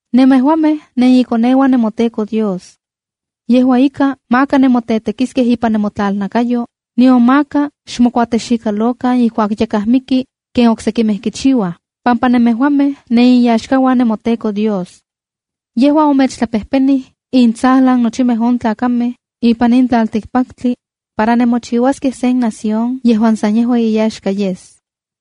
’Nemejuamej nenikoneuan nemoTEKO Dios. Yejua ika, maka nemotetekiskej ipan nemotlalnakayo, nion maka xmokuatexikalokan ijkuak yakaj miki, ken oksekimej kichiuaj, pampa nemejuamej neninyaxkauan nemoTEKO Dios. Yejua omechtlapejpenij intsajlan nochimej on tlakamej ipan in tlaltikpaktli para nemochiuaskej sen nación yejuan san yejua iyaxka yes.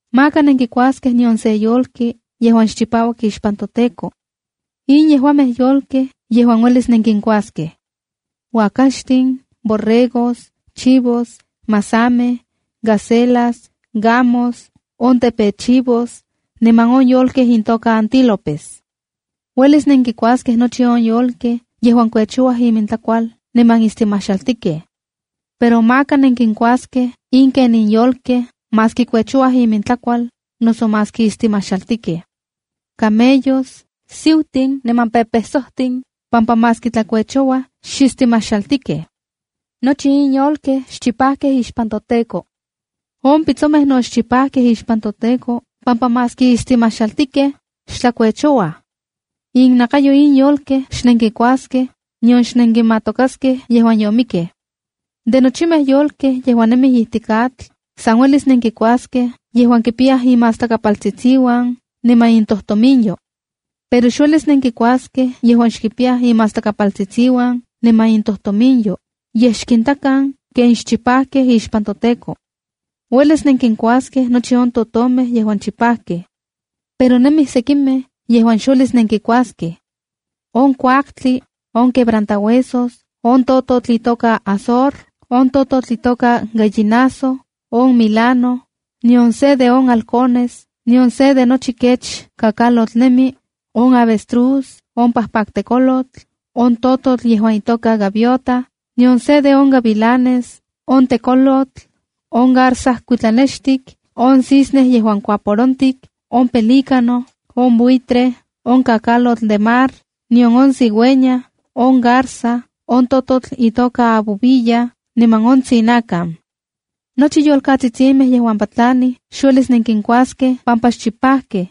’Maka nenkikuaskej nion sen yolki yejuan xchipauak ixpan toTEKO. ’In yejuamej yolkej yejuan uelis nenkinkuaskej: uakaxtin, borregos, chivos, masamej, gacelas, gamos, on tepechivos, niman on yolkej intoka antílopes. ’Uelis nenkikuaskej nochi on yolkej yejuan kuechouaj imintlakual niman istimajxaltikej. Pero maka nenkinkuaskej in ken in yolkej maski kuechouaj imintlakual, noso maski istimajxaltikej: “Camellos, siutin niman pepesojmeja, pampa maski tlakuechouaj, xistimajxaltikej. Nochi in yolkej xchipajkej ixpan toTEKO. ’On pitsomej no xchipajkej ixpan toTEKO pampa maski istimajxaltikej, xtlakuechouaj. Innakayo in yolkej xnenkikuaskej, nion xnenkimatokaskej yejuan yomikkej. ’De nochimej yolkej yejuan nemij ijtik atl, san uelis nenkikuaskej yejuan kipiyaj imastlakapaltsitsiuan niman intojtominyo. Pero xuelis nenkikuaskej yejuan xkipiyaj imatstlakapaltsitsiuan niman intojtominyo, yej xkintakan ken xchipajkej ixpan toTEKO. ’Uelis nenkinkuaskej nochi on totomej yejuan chipajkej. Pero nemij sekimej yejuan xuelis nenkikuaskej: on kuaktli, on quebrantahuesos, on tototl itoka azor, on tototl itoka gallinazo, on milano, nion se de on halcones, nion se de nochi kech kakalotl nemi, on avestruz, on pajpaktekolotl, on tototl yejuan itoka gaviota, nion se de on gavilanes, on tekolotl, on garza kuitlanextik, on cisne yejuan kuaporontik, on pelícano, on buitre, on kakalotl de mar, nion on cigüeña, on garza, on tototl itoka abubilla, niman on tsinakan. “Nochi yolkatsitsimej yejuan patlanij xuelis nenkinkuaskej pampa xchipajkej.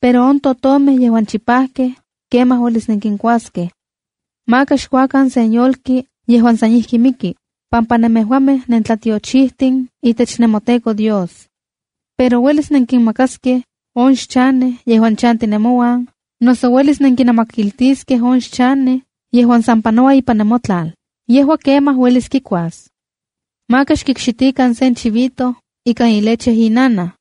Pero on totomej yejuan chipajkej, kemaj uelis nenkinkuaskej. “Maka xkuakan sen yolki yejuan san ijki miki, pampa nemejuamej nentlatiochijtin itech nemoTEKO Dios. Pero, uelis nenkinmakaskej on xchanej yejuan chanti nemouan, noso uelis nenkinamakiltiskej on xchanej yejuan san panoua ipan nemotlal. Yejua kemaj uelis kikuas. “Maka xkikxitikan sen chivito ikan ileche inanaj.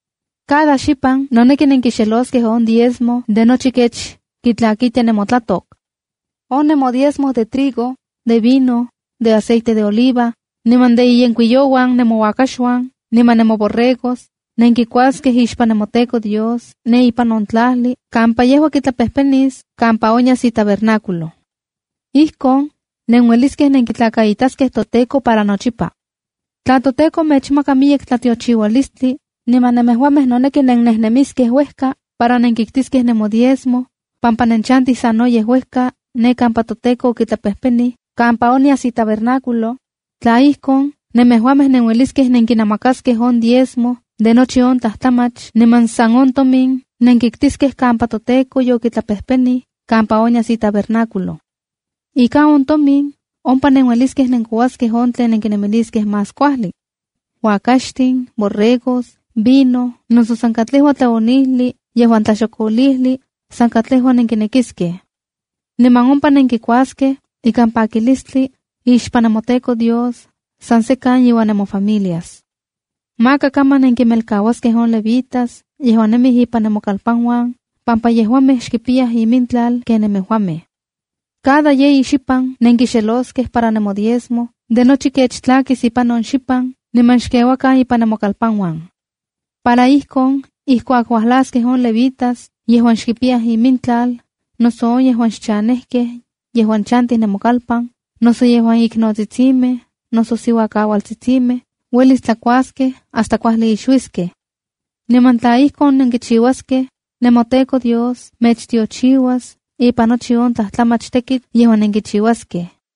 “Cada xipan noneki nenkixeloskej on diezmo de nochi kech kitlakitia nemotlatok. On nemodiezmo de trigo, de vino, de aceite de oliva, niman de inyenkuiyouan nemouakaxuan niman nemoborregos, nenkikuaskej ixpan nemoTEKO Dios ne ipan on tlajli kampa yejua kitlapejpenis kampa onyas itabernáculo kampa kitlakaitaskej itokatsin. Ijkon nenueliskej nenkitlakaitaskej toTEKO para nochipa. Tla toTEKO mechmaka miyek tlatiochiualistli, niman nemejuamej noneki nennejnemiskej uejka para nenkiktiskej nemodiezmo pampa nenchantij sanoyej uejka ne kampa toTEKO okitlapejpenij kampa onyas itabernáculo, tla ijkon, nemejuamej nenueliskej nenkinamakaskej on diezmo de nochi on tlajtlamach niman san on tomin nenkiktiskej kampa toTEKO yokitlapejpenij kampa onyas itabernáculo. Ika on tomin, ompa nenueliskej nenkouaskej on tlen nenkinemiliskej más kuajli: uakaxtin, borregos, vino, noso san katlejua tlaonijli yejuan tlaxokolijli, san katlejua nenkinekiskej. Niman ompa nenkikuaskej ikan pakilistli ixpan nemoTEKO Dios, san sekan iuan nemofamilias. ’Maka kaman nenkinmelkauaskej on levitas yejuan nemij ipan nemokalpanuan, pampa yejuamej xkipiyaj imintlal ken nemejuamej. ’Cada yeyi xipan nenkixeloskej para nemodiezmo de nochi kech tlakis ipan on xipan niman xkeuakan ipan nemokalpanuan. Para ijkon ijkuak uajlaskej on levitas yejuan xkipiyaj imintlal, noso on yejuan xchanejkej yejuan chantij nemokalpan, noso yejuan iknotsitsimej noso siuakaualtsitsimej, uelis tlakuaskej hasta kuajli ixuiskej. Niman tla ijkon nenkichiuaskej, nemoTEKO Dios mechtiochiuas ipan nochi on tlajtlamach tekitl yejuan nenkichiuaskej.